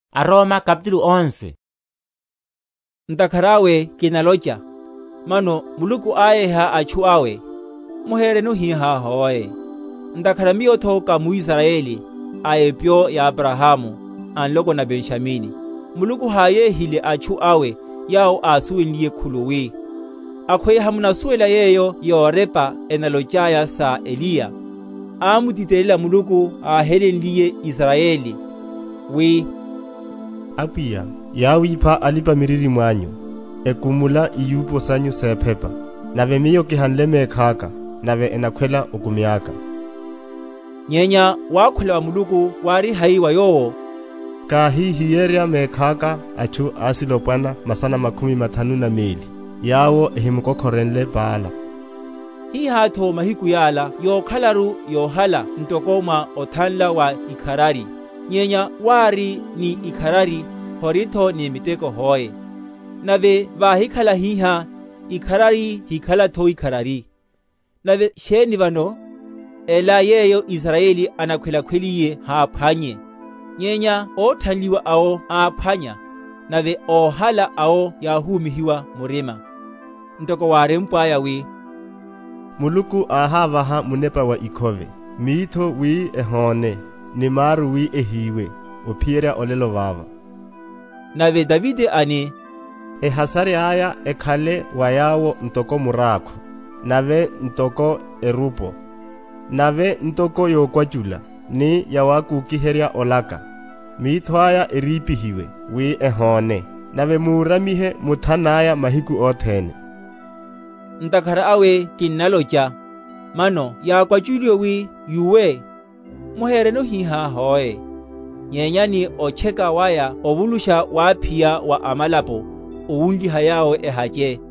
Muluku wanyanyala wawe aYuda óhiroromela. Ntakhara awe kinalocha, Mano Muluku áyeha atchu awe? Muhereno hihá hoe. Ntakhara miyotho ka muIsrayeli, a epyo ya Abrahamu, a nloko na Benjamini. Muluku háyehile atchu awe yawo ásuwenliye khuluwi. Akhweya hamunasuwela yeyo yorepa enalochaya sa Eliya? Ámutitelela Muluku áhelenliye Israyeli, wi, Apwiya, yáwipha alipa‐miririmo anyu, ekumula iyupo sanyu sephepa; nave miyo kihanle mekhaka, nave enakhwela okumi aka. Nyenya wakhula wa Muluku wáriye hai wa yowo? Káhíhiyerya mekhaka atchu asilopwana masana makhumi mathanu na meli, yawo ehimukokhorenle Baala. Hihátho mahiku yala yokhalaru yohala ntoko mwa othanla wa ikharari. Nyenya wári ni ikharari, horitho ni miteko hoe; nave váhikhala hihá, ikharari hinakhalatho ikharari. Nave sheni vano? Ela yeyo Israyeli anakhwelakhweliye haphwannye; nyenya óthanliwa awo áphwanya, nave óhala awo yáhúmihiwa murima; ntoko wárempwaya wi, Muluku áhávaha munepa wa ikhove, mitho wi ehóne, ni maru wi ehiwe, ophiyerya olelo vava. Nave Davide ani, Ehasari aya ekhale wa yawo ntoko murákho, nave ntoko erupo, Nave ntoko yokwachula, ni yawakokiherya olaka; Mitho aya erípihiwe, wi ehóne, Nave múramihe muthana aya mahiku othene. Ntakhara awe kinnalocha, Mano yákwachuliwe wi yúwe? Muhereno hihá hoe; nyenya ni otcheka waya ovulusha wáphiya wa amalapo, owunliha yawo ehache.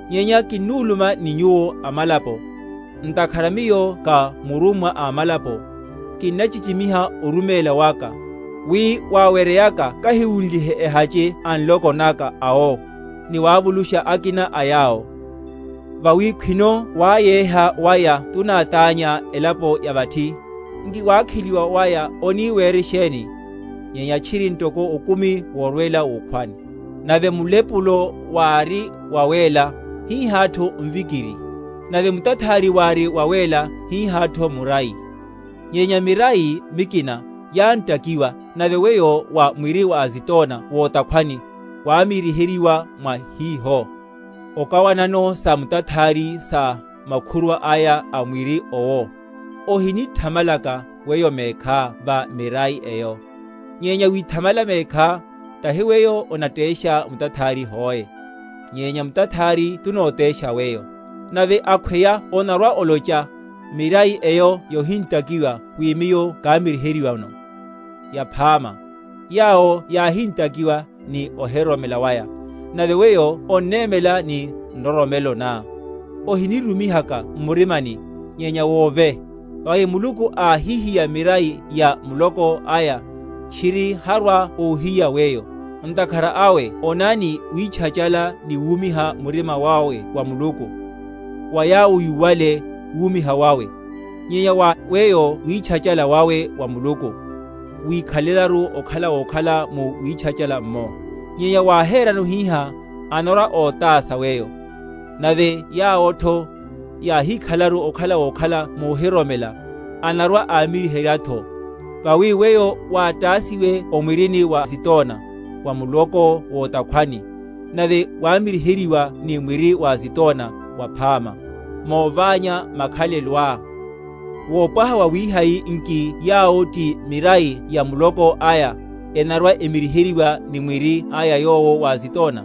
Nyenya kinuluma ni nyuwo amalapo. Ntakhara miyo ka murummwa a amalapo, kinnachichimiha oruméla waka; wi waweryeyaka kahiwunlihe ehache a nloko naka awo, ni wavulusha akina a yawo. Vawi khwino wáyeha waya tunátánya elapo ya vathi, nki wakheliwa waya oni were sheni?, nyenya tchiri ntoko okumi worwela wukhwani? Nave mulepulo wári wawéla, hihátho mvikiri; nave mutathari wári wawéla, hihátho murai. Nyenya mirai mikina yantakiwa, nave weyo, wa mwiri wa zitona wotakhwani, wámiryiheryiwa mwa hiho, okawanano sa mutathari sa makhurwa aya a mwiri owo, ohinithamalaka weyo mekhá va mirai eyo: nyenya withamala mekhá, tahi weyo onatesha mutathari, hoe, nyenya mutathari tunotesha weyo. Nave akhweya onarwa‐olocha, Mirai eyo yohintakiwa wi miyo kamiryiheryiweno. Yaphama; yawo yáhintakiwa ni ohiroromela waya, nave weyo onnémela ni nroromelo ná. Ohinirumihaka m’murimani, nyenya wove: vawi Muluku áhihiya mirai ya muloko aya, tchiri harwa‐ohiya weyo. Ntakhara awe onani witchachala ni wúmiha murima wawe wa Muluku: wa yawo yúwale, wúmiha wawe; nyenya wa weyo witchachala wawe wa Muluku, wikhalelaru okhala wokhala mu witchachala’mmo; nyenya wáherano hihá, anarwa‐otása weyo. Nave yawotho, yáhikhalelaru okhala wokhala muhiroromela, anarwa‐amiryiheryatho. Vawi weyo wátásiwe o mwirini wa zitona wa muloko wo’takhwani, nave wámiryiheryiwa ni mwiri wa zitona waphama, móványa makhaleloá; wopwaha wawihai nki yawo ti mirai ya muloko aya, enarwa‐emiryiheryana ni mwiri aya yowo wa zitona?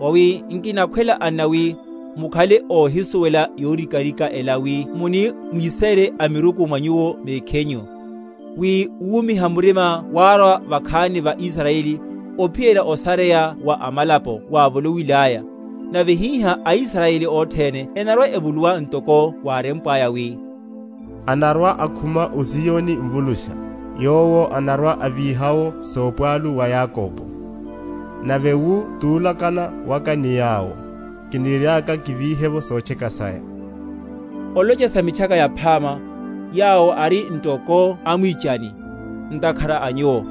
Vawi nkinakhwela, anna, wi mukhale óhisuwela yorikarika ela, wi muni mwisére amiruku mwa nyuwo mekhinyu, wi wúmiha murima wárwa vakhani va Israyeli, ophiyerya osareya wa amalapo wávoloiyaya; nave hihá aIsrayeli othene enarwa‐evuluwa; ntoko wárempwaya, wi, Anarwa‐akhuma o Ziyoni Mvulusha; Yowo anarwa‐avíha’wo sopwalu wa Yakobo: Nave wu tulakana waka ni yawo, Kiniriaka kivíhe’vo sotcheka saya. Olocha sa Mitchaka Yaphama, yawo ari ntoko amwichani, ntakhara a nyuwo;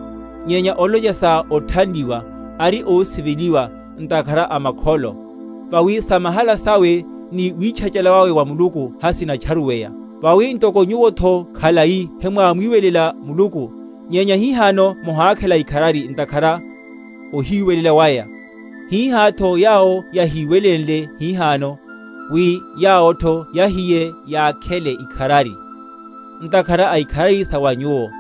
nyenya olocha sa othanliwa, ari ósiveliwa, ntakhara a makholo. Vawi samahala sawe ni witchana wawe wa Muluku hasinatcharuweya. Vawi ntoko nyuwotho khalai hemwámwiwelela Muluku, nyenya hihano mohakhela ikharari ntakhara ohiwelela waya, hihátho yawo hayíwelenle hihano, wi yawotho yahiye yakhele ikharari, ntakhara a ikharari sa wa nyuwo.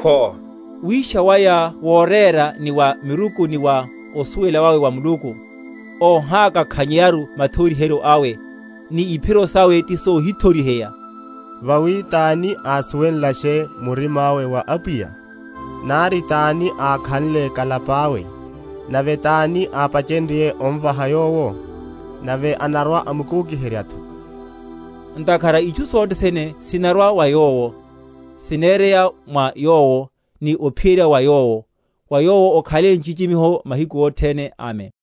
Khwo! wisha waya wóréla ni wa miruku ni wa osuwela wawe wa Muluku! Óhákakhanyeyaru mathoriheryo awe, ni iphiro sawe tisohithoriheya! Vawi tani ásuwenlashe murima awe wa Apwiya? Nari tani ákhanle kalapa awe? Nave tani ápachenrye omvaha Yowo, nave anarwa‐amukokiheryatho! Ntakhara itchu sothe sene sinarwela wa Yowo, sinereya mwa Yowo, ni ophiyerya wa Yowo. Wa Yowo okhale nchichimiho mahiku othene. Amen.